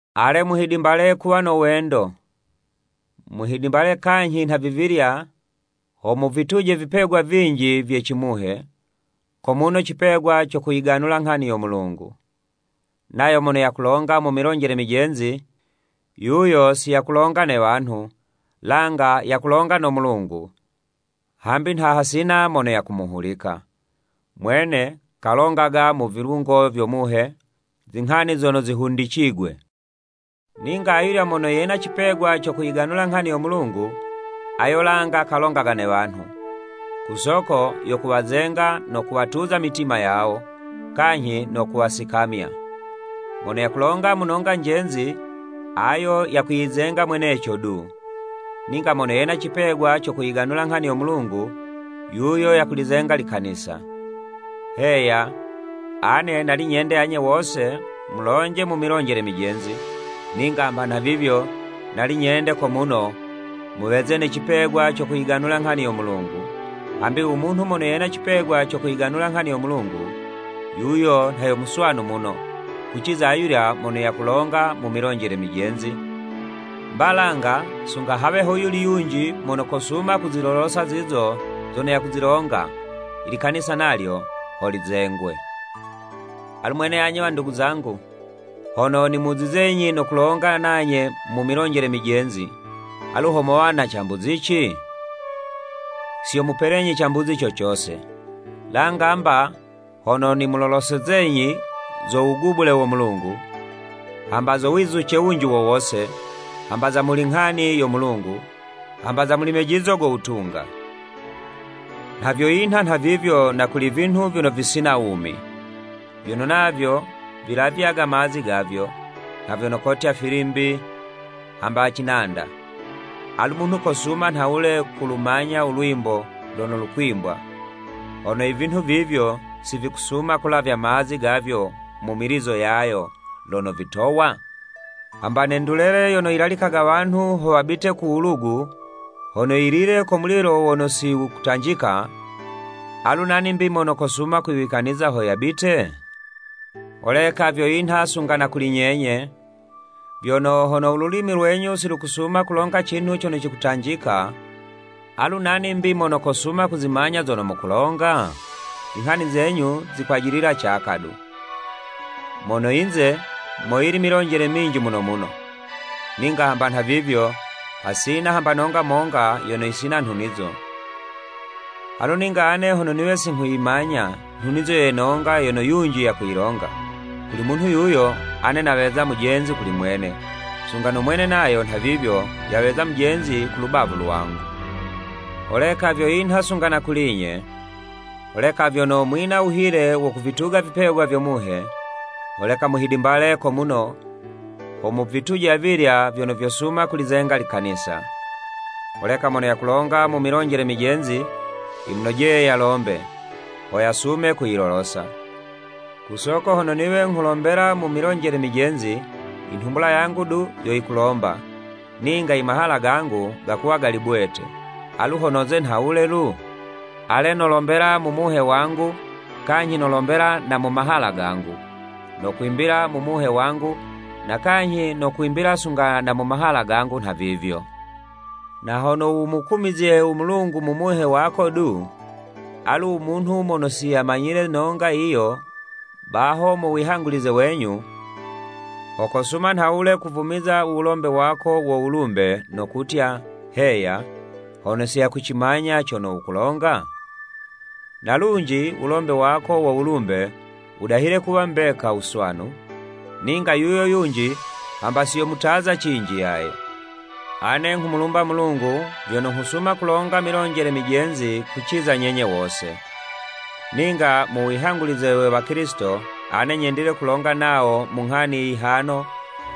Ale muhidimbale kuwa no wendo. Muhidimbale kanyhi nhavivilya, ho muvituje vipegwa vinji vye cimuhe, ko muno cipegwa co kuyiganula nghani yo Mulungu. Nayo mono yakulonga mu milonjele mijenzi, yuyo si yakulonga ne wanhu, langa yakulonga no Mulungu, hambi nha hasina mono yakumuhulika. Mwene, kalongaga mu vilungo vyo Muhe, zinghani zono zihundicigwe. Ninga ayulya mono yena cipegwa co kuyiganula nghani yo Mulungu, ayo langa kalongaga ne wanhu, ku soko yo kuwazenga, no kuwatuza mitima yawo, kanyhi no kuwasikamya. Mono yakulonga mu nonga njenzi, ayo yakwiyizenga mweneco du. Ninga mono yena cipegwa co kuyiganula nghani yo Mulungu, yuyo yakulizenga likanisa. Heya, ane nali nyende anye wose mulonje mu milonjele mijenzi, ninga hamba nhavivyo, nali nyende ko muno muweze ne cipegwa co kuyiganula nghani yo Mulungu, hambi u munhu mono yena cipegwa co kuyiganula nghani yo Mulungu, yuyo nha yo muswanu muno, kuciza ayulya mono yakulonga mu milonjele mijenzi, mba langa, sunga hawe ho yuli yunji mono kosuma kuzilolosa zizo zono yakuzilonga, i likanisa nalyo ho lizengwe. Alu mwene anye wandugu zangu, hono nimuzizenyi no kulongana nanye mu milonjele mijenzi, alu ho mowa na cambuzici? Si yomupelenyi cambuzi co cose, langa mba, hono nimulolosezenyi zo wugubule wo Mulungu, hamba zo wizuce wunji wo wose, hamba za muli nghani yo Mulungu, hamba za muli mejizo go wutunga. Nha vyo yinha nhavivyo na kuli i vinhu vyono visina wumi, vyono navyo vilavyaga mazi gavyo, nha vyono kotya, filimbi, hamba cinanda. Alu munhu kosuma nhawule kulumanya u lwimbo lono lukwimbwa, hono i vinhu vivyo, si vikusuma kulavya mazi gavyo mu milizo yayo lono vikutowa? Hamba ne ndulele yono yilalikaga wanhu ho wabite ku wulugu, hono yilile ko mulilo wono si wukutanjika, alu nani 'mbi, mono kosuma kwiwikaniza ho yabite? Holeka vyo yinha sunga na kuli nyenye, vyono hono u lulimi lwenyu si lukusuma kulonga cinhu cono cikutanjika, alu nani 'mbi mono kosuma kuzimanya zono mukulonga? Zinghani zenyu zokwajilila caka du. Mono yinze, moyili milonjele minji muno muno, ninga hamba nhavivyo, hasina hamba nonga monga yono yisina nhunizo. Alu ninga, ane hono niwe si nghuyimanya nhunizo ye nonga yono yunji yakuyilonga, kuli munhu yuyo, ane naweza mujenzi kuli mwene, sunga no mwene nayo nhavivyo yaweza mujenzi kulu bavu lwangu. Holeka vyo yinha sunga na kuli'nye, holeka vyono mwina wuhile wo kuvituga vipegwa vyo Muhe, holeka muhidimbale ko muno, ho muvituje avilya vyono vyosuma kulizenga likanisa. Holeka mono yakulonga mu milonjele mijenzi, yimunojeye yalombe, ho yasume kuyilolosa. Ku soko hono niwe kulombela mu milonjele mijenzi, i nhumbula yangu du yo yikulomba, ninga i mahala gangu gakuwa gali bwete. Alu ho noze nhawule lu? Ale, nolombela mu muhe wangu kanyhi nolombela na mu mahala gangu, nokwimbila mu muhe wangu, na kanyhi nokwimbila sunga na mu mahala gangu nha vivyo. Na hono wumukumizye u Mulungu mu muhe wako du, alu u munhu mono si yayimanyile nonga yiyo baho mu wihangulize wenyu, ho kosuma nhawule kuvumiza u wulombe wako wo wulumbe, no kutya, “Heya” hono si yakucimanya cono wukulonga? Na lunji u wulombe wako wo wulumbe, wudahile kuwa mbeka wuswanu, ninga yuyo yunji hamba si yomutaza cinji yaye. Ane nghumulumba u Mulungu vyono nghusuma kulonga mu milonjele mijenzi kuciza nyenye wose. Ninga mu wihangulize we Wakilisito, ane nyendile kulonga nawo mu nghani yihano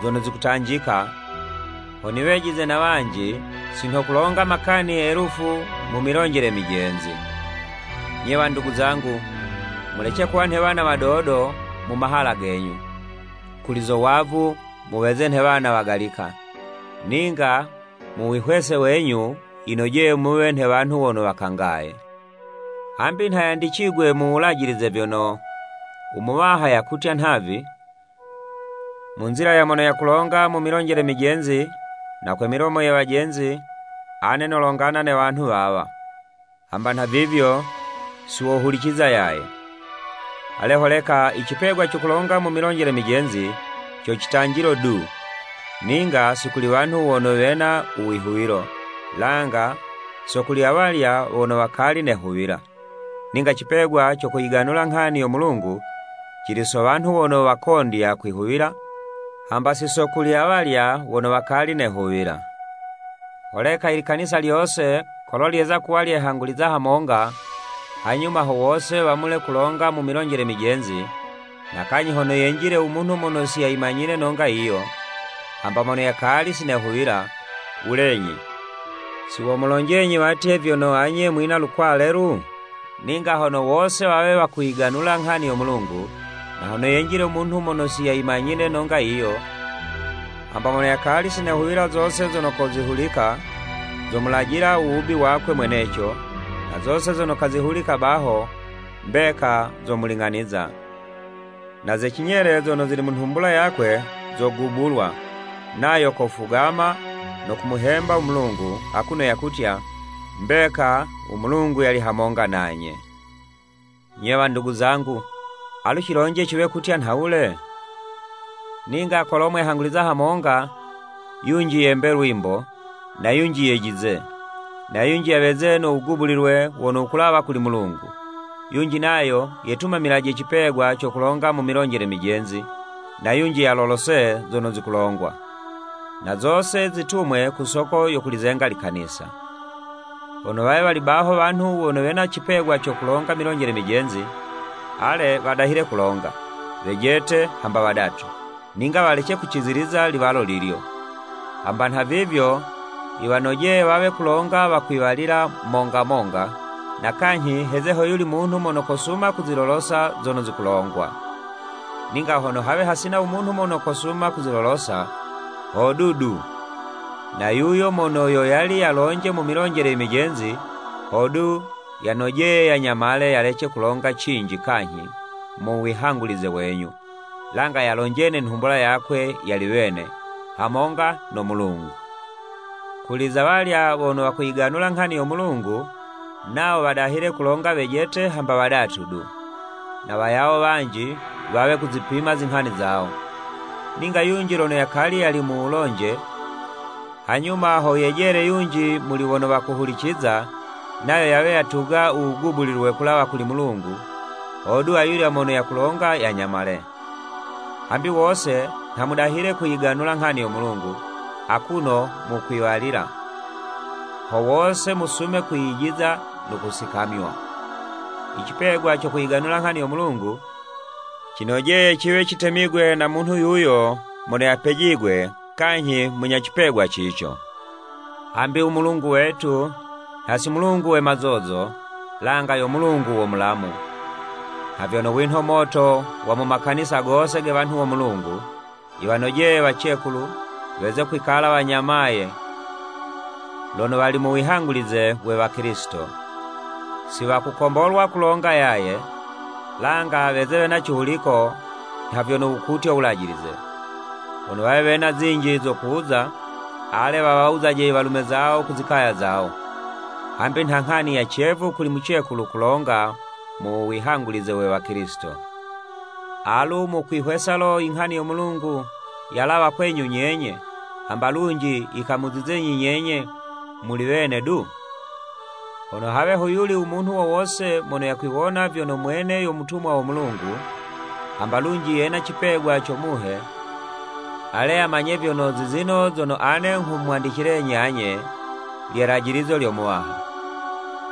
zono zikutanjika ho niwejize na wanji, si nho kulonga makani elufu mu milonjele mijenzi. Nye wandugu zangu, mulece kuwa nhe wana wadodo mu mahala genyu. Kuli zo wavu, muweze nhe wana wagalika, ninga mu wihwese wenyu, yinojeye muwe nhe wanhu wono wakangaye. Hambi nha yandicigwe mu Wulajilize vyono, “U Muwaha yakutya nhavi, ‘Mu nzila ya mono yakulonga mu milonjele mijenzi na kwe milomo ye wajenzi, ane nolongana ne wanhu wawa, hamba nhavivyo, siwohuliciza yaye.'" Ale, holeka, i cipegwa co kulonga mu milonjele mijenzi, co citanjilo du, ninga si kuli wanhu wono wena u wihuwilo, langa so kuli awalya wono wakali nehuwila, ninga cipegwa co kuyiganula nghani yo Mulungu, cili so wanhu wono wakondya kwihuwila hamba si so kuli awalya wono wakali nehuwila. Holeka i likanisa lyose kolo lyeza kuwa lyehanguliza hamonga, hanyuma ho wose wamule kulonga mu milonjele mijenzi, na kanyhi hono yenjile u munhu mono si yayimanyile nonga yiyo, hamba mono yakali si nehuwila, wulenyi, si womulonjenyi watye vyono anye mwina lukwale lu? Ninga hono wose wawe wakuyiganula nghani yo Mulungu, na hono yenjile u munhu mono si yayimanyile nonga yiyo, hamba mono yakali si nehuwila zose zono kozihulika, zomulajila u wubi wakwe mweneco, na zose zono kozihulika baho, mbeka zomuling'aniza. Na ze cinyele zono zili mu nhumbula yakwe zogubulwa, nayo kufugama no kumuhemba u Mulungu, akuno yakutya, “Mbeka, u Mulungu yali hamonga nanye.” Nye wandugu zangu, alu cilonje ciwe kutya nhawule? Ninga kolo mwehanguliza hamonga, yunji yembe lwimbo, na yunji yejize, na yunji yaweze no wugubulilwe wono wukulawa kuli Mulungu, yunji nayo yetumamilaje cipegwa co kulonga mu milonjele mijenzi na yunji yalolose zono zikulongwa. Na zose zitumwe ku soko yo kulizenga likanisa. Hono wawe wali baho wanhu wono wena cipegwa co kulonga milonjele mijenzi, ale, wadahile kulonga, wejete hamba wadatu, ninga walece kuciziliza liwalo lilyo, hamba nhavivyo, yiwanojeye wawe kulonga wakwiwalila monga monga, na kanyhi heze hoyuli munhu mono kosuma kuzilolosa zono zikulongwa. Ninga hono hawe hasina u munhu mono kosuma kuzilolosa, hodu du, na yuyo mono yo yali yalonje mu milonjele i mijenzi, hodu yanojeye yanyamale yalece kulonga cinji kanyhi mu wihangulize wenyu, langa yalonje ne nhumbula yakwe yali wene, hamonga no Mulungu. Kuli za walya wono wakuyiganula nghani yo Mulungu, nawo wadahile kulonga wejete hamba wadatu du, na wayawo wanji, wawe kuzipima zinghani zawo. Ninga yunji lono yakali yali mu wulonje, hanyuma ho yejele yunji muli wono wakuhuliciza, nayo yawe yatuga u wugubulilwe kulawa kuli Mulugu, hodu ayulya mono yakulonga yanyamale. Hambi wose nha mudahile kuyiganula nghani yo Mulungu akuno mukwiwalila, ho wose musume kwiyijiza no kusikamywa. I cipegwa co kuyiganula nghani yo Mulungu, cinojeye ciwe citemigwe na munhu yuyo mono yapejigwe kanyhi munya cipegwa cico. Hambi u Mulungu wetu, nha si Mulungu we mazozo, langa yo Mulungu wo mulamu. Nha vyono winho moto wa mu makanisa gose ge wanhu wo Mulungu, yiwanojeye wacekulu, weze kwikala wanyamaye lono wali mu wihangulize we Wakilisito. Si wakukombolwa kulonga yaye, langa weze wena cihuliko nha vyono wukutya Wulajilize. Hono wawe wena zinji zo kuwuza, ale, wawawuzaje i walume zawo ku zikaya zawo, hambi nha nghani ya cevu kuli mucekulu kulonga mu wihangulize we wakilisito. Alu mukwihwesa lo, inghani yo Mulungu yalawa kwenyu nyenye, hamba lunji yikamuzizenyi nyenye muli wene du? Hono hawe hoyuli u munhu wo wose mono yakwiwona vyono mwene yo mutumwa wo Mulungu, hamba lunji yena cipegwa co Muhe, ale yamanye vyono, zizino zono ane nghumwandicilenyi anye, lye 'lajilizo lyo Muwaha.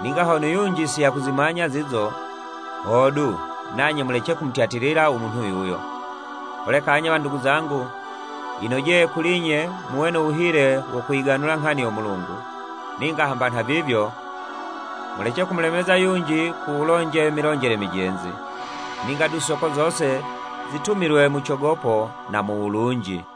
Ninga hono yunji si yakuzimanya zizo, hodu, nanye mulece kumutyatilila u munhu yuyo. Holeka anye wandugu zangu, yinojeye kuli'nye muwe no wuhile wo kuyiganula nghani yo Mulungu, ninga hamba nhavivyo, mulece kumulemeza yunji ku wulonje milonjele mijenzi. Ninga du soko zose zitumilwe mu cogopo na mu wulunji.